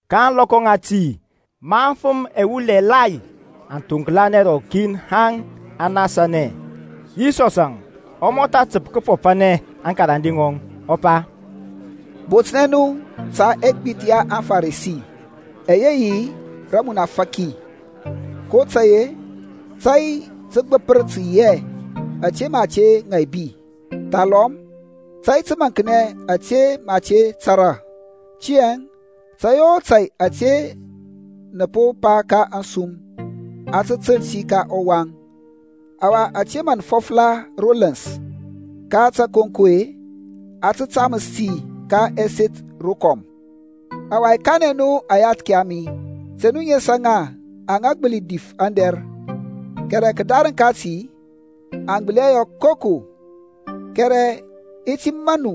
Ka ȧŋlɔkɔ ŋati, ma afəm ɛwul ɛgbathȧ aŋ thoŋklanɛ rɔkin haŋ aŋ nasanɛ, Yisɔsȧŋ ɔ mɔtha təp tə kəfɔfanɛ aŋkarande ŋɔŋ, ɔ pa, Botnɛ nu ta ɛgbith ya aŋFarisi, ɛyɛ yi rəmunafaki kotȧy-e tȧy təgbəpər tə yi hɛ ȧte mə a te ŋaibi, thalɔm tȧy təmaŋknɛ ȧte mə a te tȧrȧ. Tiyȧŋ tȧy o tȧy ȧte nə po pa ka ȧŋsum a tə təl ti ka ɔwaŋ. Ɔwa ȧte mə nə fɔfla ro ləns ka tȧkonko-e, a tə taməs ti ka ɛseth rokɔm. Ɔwa i kanɛ nu aŋyathki a mi, Te nu nesa ŋa aŋa gbəli dif aŋdɛr, kɛrɛ kədarəŋ kati aŋ gbəli hɛ yɔ koko. Kɛrɛ i ti maŋ nu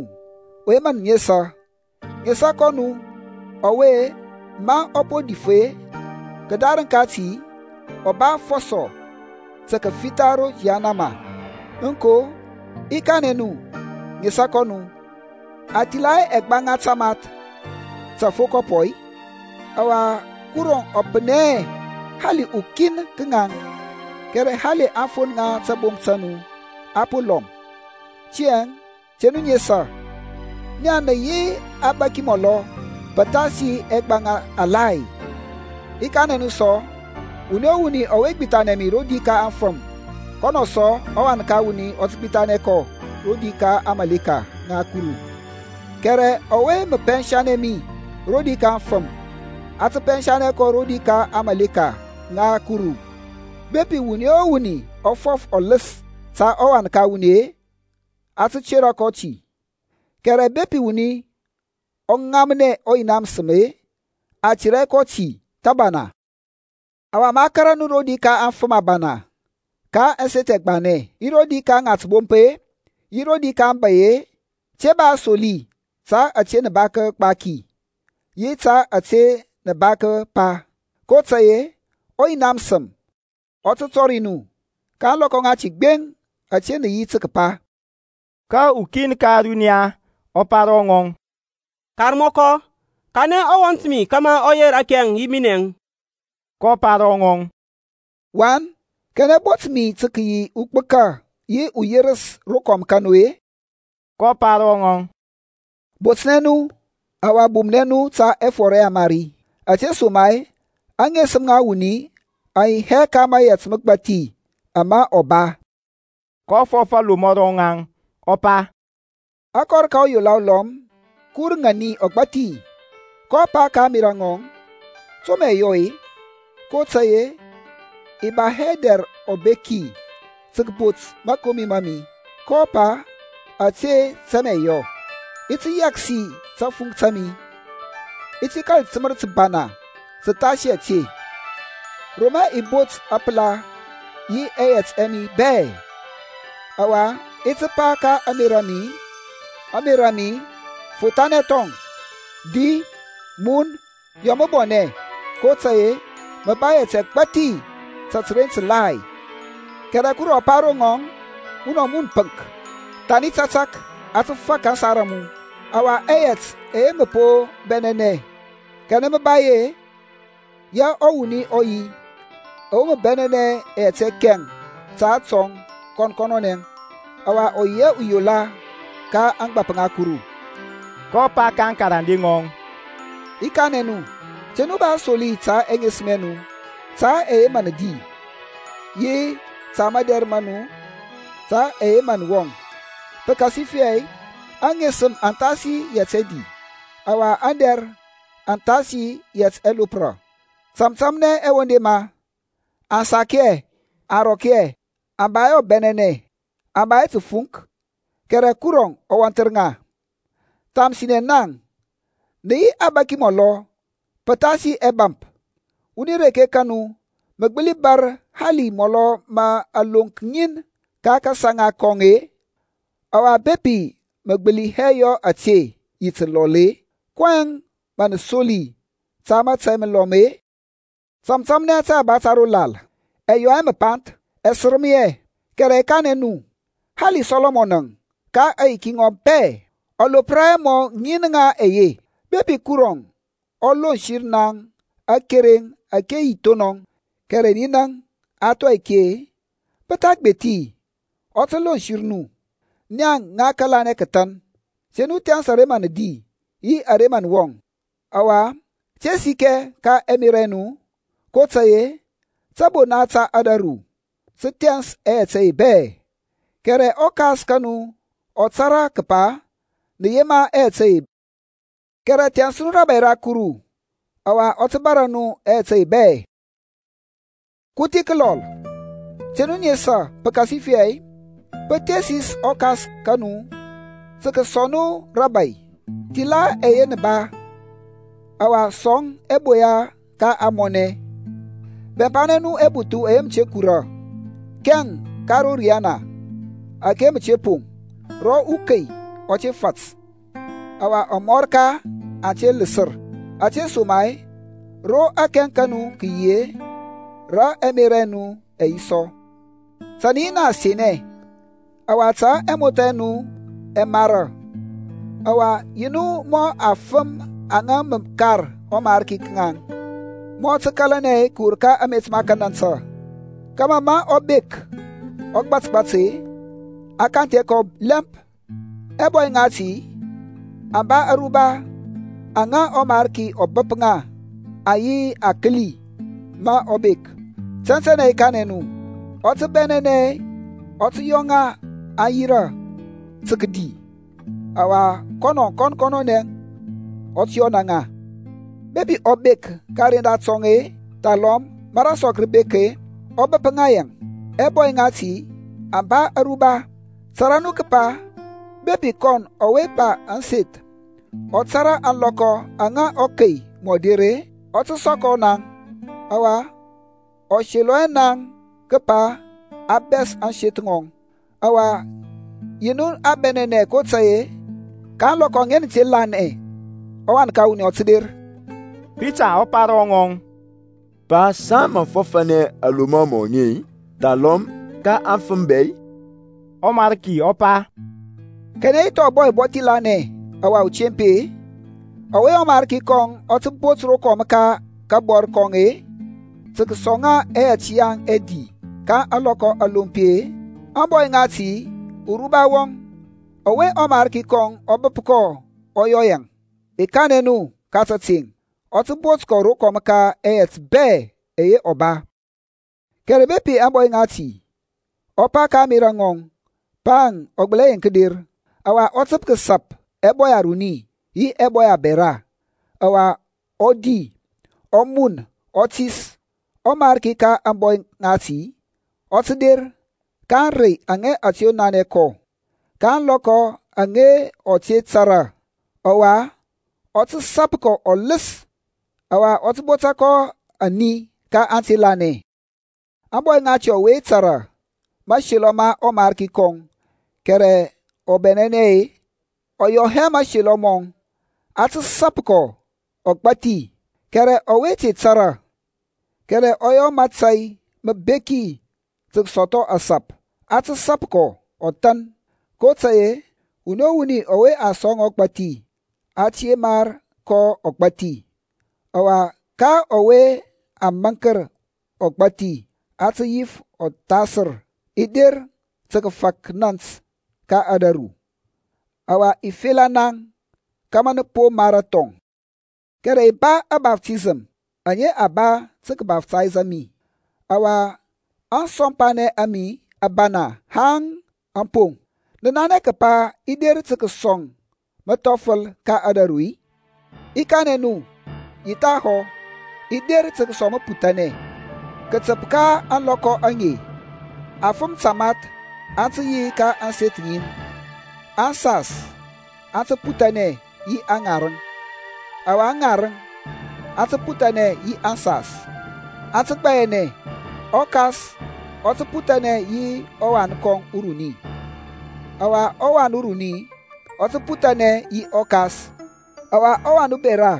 ɔwe mə nə nesa. Nesa kɔ nu ɔwe, ma a po dif-e, kədarəŋ kati ɔ ba aŋfɔsɔ tə kəfitha ro yahanama. Aŋko, i kanɛ nu, nesa kɔ nu. A thila hɛ ɛgbaŋa tamath ta afokɔpɔ-i? Ɔwa Kurɔŋ ɔ pənɛ hɛ hali ukin ka ŋaŋ. Kɛrɛ hali aŋfon ŋa tabomp ta nu a po lɔm. Tiyȧŋ te nu nesa. Naŋ nə yi abȧki mɔlɔ pəthasi ɛgbaŋa alai. I kanɛ nu sɔ, wuni o wuni ɔwe gbithanɛ mi rodi ka aŋfəm, kɔnɔ sɔ, ɔWan ka wuni ɔ tə gbithanɛ kɔ rodi ka aŋmȧleka ŋa Kuru, kɛrɛ ɔwe mə pɛnsa mi rodi ka aŋfəm, a tə pɛnsa kɔ rodi ka aŋmȧleka ŋa Kuru. Bepi wuni o wuni ɔ fɔf ɔləs ta ɔWan ka wuni-e, a tə tera kɔ ti, kɛrɛ bepi wuni ɔ ŋamnɛ ɔYina məsəm-e a tera hɛ kɔ ti thəbana. Ɔwa maŋ kȧrȧ nu rodi ka aŋfəm abana ka ɛseth ɛgbanɛ yi rodi ka ŋatəbomp-e, yi rodi ka aŋbȧy-e, te ba asoli ta ȧte nə ba kəgbaki, yi ta ȧte nə ba kəpa; kotȧy-e ɔYina məsəm ɔ tə tɔri nu ka ȧŋlɔkɔ ŋati gbeŋ ȧte nə yi tə kəpa. Ka ukin ka ȧruniya ɔ pa ro ŋɔŋ, Karmɔkɔ, kanɛ ɔwɔnt mi kȧmȧ ɔ yer akɛŋ yi minɛŋ. kɔ pa ro ŋɔŋ, Wan, kanɛ bot mi tə kəyi ugbəka yi uyerəs rokɔm ka nu-e? kɔ pa ro ŋaŋ, Botnɛ nu, ɔwa bumnɛ nu ta ɛfɔr ɛyamari, ȧtesoma-e aŋesəm ŋa wuni aŋ yi hɛ ka mȧyɛt məgbathi ama ɔ ba. kɔ fɔf alomɔ ro ŋaŋ, ɔ pa, Akɔr ka uyola ulɔm kə wur ŋani ɔgbȧthi. kɔ pa ka ȧŋmerȧ ŋɔŋ, To mə i yɔ-e? kotȧy-e i ba hɛ dɛr ɔbeki tə kəbot mȧkomi ma mi. kɔ pa, Ȧte tə mə i yɔ; i ti yɛksi tȧfunk ta mi, i ti kȧl təmər təbana təthasi ȧte, ro mə i bot ȧpəla yi ɛyɛt ɛ mi bɛ. Ɔwa i ti pa ka ȧŋmerȧ mi, Ȧŋmerȧ mi, fothanɛ thɔŋ, di, mun, yɔ məbɔnɛ, kotȧy-e mə ba ɛyɛt ɛgbathi ta təren ǝgbathi. Kɛrɛ Kurɔŋ ɔ pa ro ŋɔŋ, Munɔ wuni pəŋk, thani tȧtȧk a tə fak aŋsar a mu. Ɔwa ɛyɛt ɛyɛ mə po bɛnɛnɛ, kanɛ mə ba yi-e? Ya ɔwuni ɔ yi ɔwe mə bɛnɛnɛ ɛyɛt ɛkɛŋ ta kɔn kɔnɔnɛ, ɔwa ɔ yi hɛ uyola ka ȧŋgbȧp ŋa Kuru. kɔ pa ka aŋkarande ŋɔŋ, I kanɛ nu, te nu ba asoli ta ɛŋesəm ɛ nu, ta ɛyɛ mə nə di, yi ta madɛr ma nu ta ɛyɛ mə nə wɔŋ. Pəkasifɛ aŋesəm aŋ thasi yɛt ɛdi, ɔwa aŋdɛr aŋ thasi yɛt ɛlopra. Tȧmtȧmnɛ ɛwendema, aŋ sak hɛ, aŋ rɔk hɛ, aŋ ba hɛ dɛr ɔbɛnɛnɛ, aŋ ba hɛ təfuŋk, kɛrɛ Kuru ɔ wɔnthər ŋa. Thamsinɛ naŋ nə yi abȧki mɔlɔ pəthasi ɛbȧmp! Wuni reke ka nu ɔwe mə gbəli bȧr hali mɔlɔ ma aloŋk ŋin ka kasaŋa kɔŋ-e? Ɔwa bepi mə gbəli hɛ yɔ ȧte yi təlɔl-e, kɔyɛŋ mə nə soli ta mȧtȧy məlɔm-e? Tȧmtȧmnɛ tȧyaba ta ro lal mɔ mə ɛ lɔkɔ, ɛ yɔ hɛ məpanth, ɛ sərəm hɛ, kɛrɛ i kanɛ nu, hali Sɔlɔmɔn ka aŋyiki ŋɔŋ bɛ ɔ lopra hɛ mɔ ŋin ŋa ɛye. Bepi Kuru ɔ lonsər naŋ akereŋ ȧke yi thonɔŋ, kɛrɛ ninaŋ a thɔi ki-e, pɔ tha gbethi ɔ tə lonsər nu, nia ŋa kəlanɛ kəthan! Te nu thɛns ara mə nə di, yi ara mə nə mun, ɔwa te sikɛ ka ɛmerȧ ɛ nu, kotȧy-e tȧbona ta ȧdȧru tə thɛns ɛyɛt ɛye bɛ; kɛrɛ ɔKas ka nu ɔ tȧrȧ kəpa nə yema ɛyɛt ɛye. Kɛrɛ thɛns nu rȧbȧy ra Kuru, ɔwa a tə bȧrȧ nu ɛyɛt ɛye bɛ. Kuthi kəlɔl, te nu nesa; pəkasifɛ pə thesis ɔKas ka nu tə kəsɔŋ nu rȧbȧy. Thila ɛyɛ nə ba, ɔwa sɔŋ ɛboya ka ȧŋmɔnɛ, bɛmpanɛ nu ɛbuthu ɛyɛ mə te kura, kɛŋ ka ro riyana ȧke mə te poŋ ro ukei ɔ te fat ɔwa amɔrka aŋ te ləsər. Ȧtesoma-e ro akɛŋ ka nu kə yi-e, rə ɛmerȧ ɛ nu ɛ yi sɔ. Ta nə yi na asenɛ, ɔwa ta ɛmothȧ ɛ nu ɛ mara; ɔwa yi nu mɔ afəm aŋa mə kar ɔMarki ka ŋaŋ, ma ɔ tə kȧlanɛ kəwur ka amet ma kənantə, kȧmȧ ma ɔ bek, ɔ gbȧtgbȧt-e, a kanthɛ kɔ lɛmp. Ɛbɔy ŋati aŋ ba ȧruba aŋa ɔMarki ɔ bəp ŋa aŋ yi akəli ma ɔ bek. Tɛntɛnɛ i kanɛ nu, ɔ tə bɛnɛnɛ, ɔ tə yɔ ŋa aŋ yirȧ tə kədi, ɔwa kɔn kɔnɔnɛ ɔ tə yɔna ŋa. Bepi ɔ bek ka kəren datɔŋ-e, thalɔm ma rasɔk rə bek-e, ɔ bəp ŋa yaŋ, ɛbɔy ŋati aŋ ba aruba. Tara nu kəpa bepi kɔn ɔwe ba ȧŋseth ɔ tȧrȧ ȧŋlɔkɔ aŋa ɔkei mɔ der-e, ɔ tə sɔkɔ naŋ, ɔwa ɔ selɔ hɛ naŋ kəpa a bɛs ȧŋseth ŋɔŋ. Ɔwa yi nu abɛnɛnɛ kotȧy-e ka ȧŋlɔkɔ aŋa nə te lanɛ ɔWan ka wuni ɔ tə der. Pita ɔ pa ro ŋɔŋ, Pa, saŋ mə fɔfȧnɛ aŋlomɔ aŋe-i, thalɔm ka afəm bɛ-i? ƆMariki ɔ pa, Kanɛ yi thɔŋ ȧŋbɔy ubɔthi lanɛ ɔwa utempi-e, ɔwe ɔMarki kɔŋ ɔ tə bot rokɔm ka kabɔr kɔŋ-e, tə kəsɔŋ ŋa ɛyɛt yaŋ ɛdi ka ȧŋlɔkɔ alompi-e? Ȧŋbɔy ŋati uruba wɔŋ ɔwe ɔMarki kɔŋ ɔ bəp kɔ ɔ yɔ yaŋ. I kanɛ nu ka tȧteŋ, ɔ tə bot kɔ rokɔm ka ɛyɛt bɛ ɛyɛ ɔ ba. Kɛrɛ bepi ȧŋbɔy ŋati ɔ pa ka ȧŋmerȧ nɔŋ, Pa-əŋ ɔ gbəli hɛ yeŋk der; ɔwa ɔ təp kəsap ɛbɔy aruni yi ɛbɔy abɛra, ɔwa ɔ di, ɔ mun, ɔ tis, ɔMarki ka ȧŋbɔy ŋati ɔ tə der ka ȧŋrey aŋa ɔ te nanɛ kɔ, ka ȧŋlɔkɔ aŋa ɔ te tȧrȧ, ɔwa ɔ tə sap kɔ ɔləs, ɔwa ɔ tə botȧ kɔ ani ka ante lanɛ. Ȧŋbɔy ŋati ɔwe tȧrȧ mȧselɔ ma ɔMarki kɔŋ, kɛrɛ ɔ bɛnɛnɛ hɛ, ɔ yɔ hɛ mȧselɔ mɔŋ, a tə sap kɔ ɔgbȧthi; kɛrɛ ɔwe te tȧrȧ, kɛrɛ ɔ yɔ mȧtȧy məbeki tə kəsɔthɔ kəsap, a tə sap kɔ ɔthan. Kotȧy-e rə wuni o wuni ɔwe a sɔŋ ɔgbȧthi a tə yemar kɔ ɔgbȧthi; ɔwa ka ɔwe a maŋkər ɔgbȧthi a tə yif ɔthasər. I der tə kəfak nȧnt ka ȧdȧru; ɔwa i fela naŋ kȧmȧ nə po mara thɔŋ. Kɛrɛ i ba ȧbaftisəm aŋa a ba tə kəbaftaysȧ mi; ɔwa ȧŋsɔmpanɛŋ a mi a bana haŋ aŋ poŋ! Nə nanɛ kəpa i der tə kəsɔŋ məthɔfəl ka raru-i? I kanɛ nu, yi thahɔ, i der tə kəsɔŋ məputhanɛ. Kətəp ka ȧŋlɔkɔ aŋe afəm tamath aŋ tə yi ka ȧŋseth ŋin, aŋsas aŋ tə puthanɛ yi aŋarəŋ, ɔwa aŋarəŋ aŋ tə puthanɛ yi aŋsas. Aŋ tə gbayanɛ, ɔkas ɔ tə puthanɛ yi ɔwan kɔŋ uruni, ɔwa ɔwan uruni ɔ tə puthanɛ yi ɔkas; ɔwa ɔwan ubɛra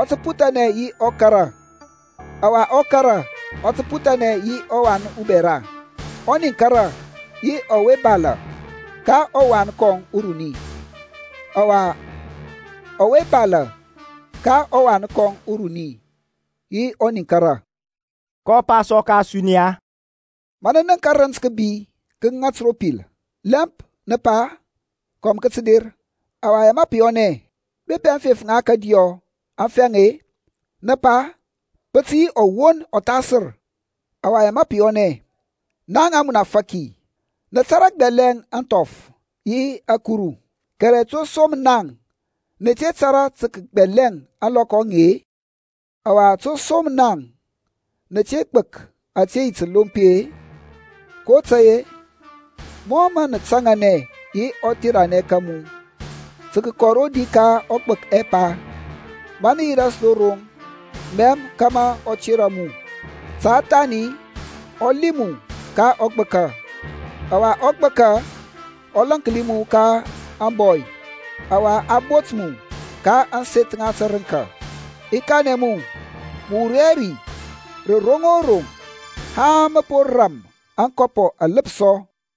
ɔ tə puthanɛ yi ɔkara, ɔwa ɔkara ɔ tə puthanɛ yi ɔwan ubɛra; ɔniŋkara yi ɔwe balȧ ka ɔwan kɔŋ uruni, ɔwa ɔwe balȧ ka ɔwan kɔŋ uruni yi ɔniŋkara. kɔ pa sɔ ka ȧsuniya, Ma nə nənk kərənt kȧbi kə ŋat ro pil, lɛmp nə pa, Kɔm kə tə der; ɔwa ya pə yɔnɛ. Bepi aŋfef ŋa kȧdiyɔ aŋ fɛŋ-e, nə pa, Pə tə yi ɔwon ɔthasər, ɔwa ya pə yɔnɛ. Naŋ amunafaki, nə tȧrȧ gbɛlɛŋ ȧŋthɔf yi ȧkuru, kɛrɛ to som naŋ nə te tȧrȧ tə kəgbɛlɛŋ ȧŋlɔkɔ aŋe-e? Ɔwa to som naŋ nə te gbək ȧtȧ yi təlompi-e? kotȧy-e mɔ mə nə taŋanɛ yi ɔtheranɛ ka mu tə kəkɔ rodi ka ɔgbək ɛpa, ma nə yi ras ro roŋ, mɛm kȧmȧ ɔ tera mu; ta thani ɔ liŋ mu ka ɔgbəka, ɔwa ɔgbəka ɔ lȧnki mu ka ȧŋbɔy, ɔwa ɔ bot mu ka ȧŋseth ŋa tərəŋka. I kanɛ mu mə wur hɛ ri rə roŋ o roŋ haŋ mə po ram ȧŋkɔpɔ aləpsɔ.